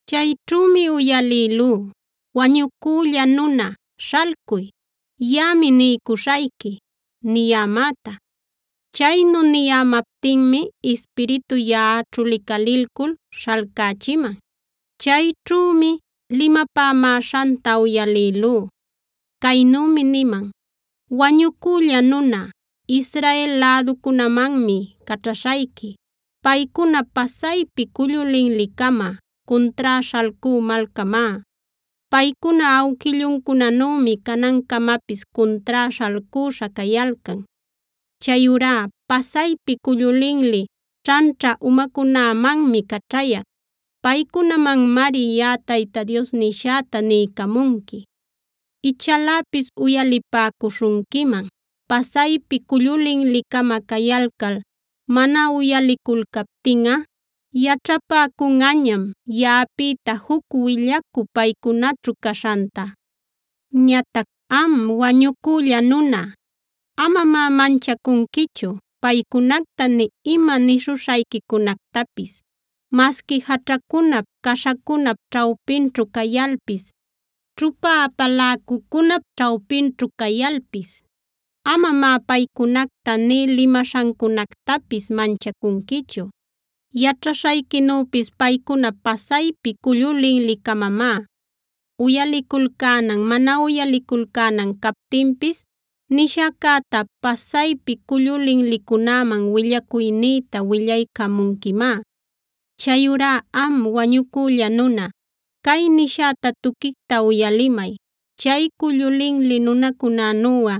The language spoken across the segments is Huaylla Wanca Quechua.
Chayćhümi uyalïlú: “Wañucülla nuna, śhalcuy. Yaꞌami niycuśhayqui” niyämäta. Chaynu niyämaptinmi Ispiritu yaꞌaćhu licalilcul śhalcächiman. Chayćhümi limapämäśhanta uyalïlú. Caynümi niman: “Wañucülla nuna, Israel läducunämanmi caćhaśhayqui. Paycuna pasaypi cullu linli-cama, cuntrá śhalcü malcamá. Paycuna awquilluncunanümi canancamapis cuntrá śhalcüśha cayalcan. Chayurá pasaypi cullu linli, ćhanćha umacunämanmi caćhayac. Paycunamanmari yaꞌa Tayta Dios nishäta niycamunqui. Ichaläpis uyalipäcuśhunquiman. Pasaypi cullu linli-cama cayalcal mana uyaliculcaptinꞌa yaćhapäcunꞌañam yaꞌapïta juc willacü paycunaćhu caśhanta. Ñatac am, wañucülla nuna, amamá manchacunquichu paycunacta nï ima nishuśhayquicunactapis. Masqui jaćhacunap, caśhacunap ćhawpinćhu cayalpis, ćhupa apaläcucunap ćhawpinćhu cayalpis amamá paycunacta nï limaśhancunactapis manchacunquichu. Yaćhaśhayquinüpis paycuna pasaypi cullu linli-camamá. Uyaliculcänan mana uyaliculcänan captinpis nishäcäta pasaypi cullu linlicunäman willacuynïta willaycamunquimá. Chayurá am, wañucülla nuna, cay nishäta tuquicta uyalimay. Chay cullu linli nunacunänuꞌa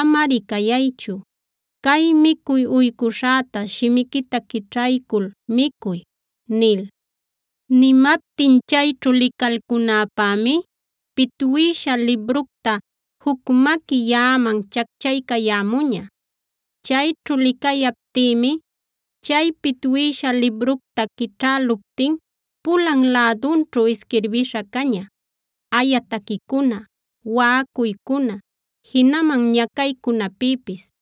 amari cayaychu. Cay micuy uycuśhäta shimiquita quićhaycul micuy” nil. Nimaptin chayćhu licalcunäpämi pitwïsha libructa juc maqui yaꞌaman chacchaycayämuña. Chayćhu licayaptïmi chay pitwïsha libructa quićhäluptin pulan lädunćhu isquirbïsha caña:a aya taquicuna, waꞌacuycuna, jinaman ñacaycunapïpis.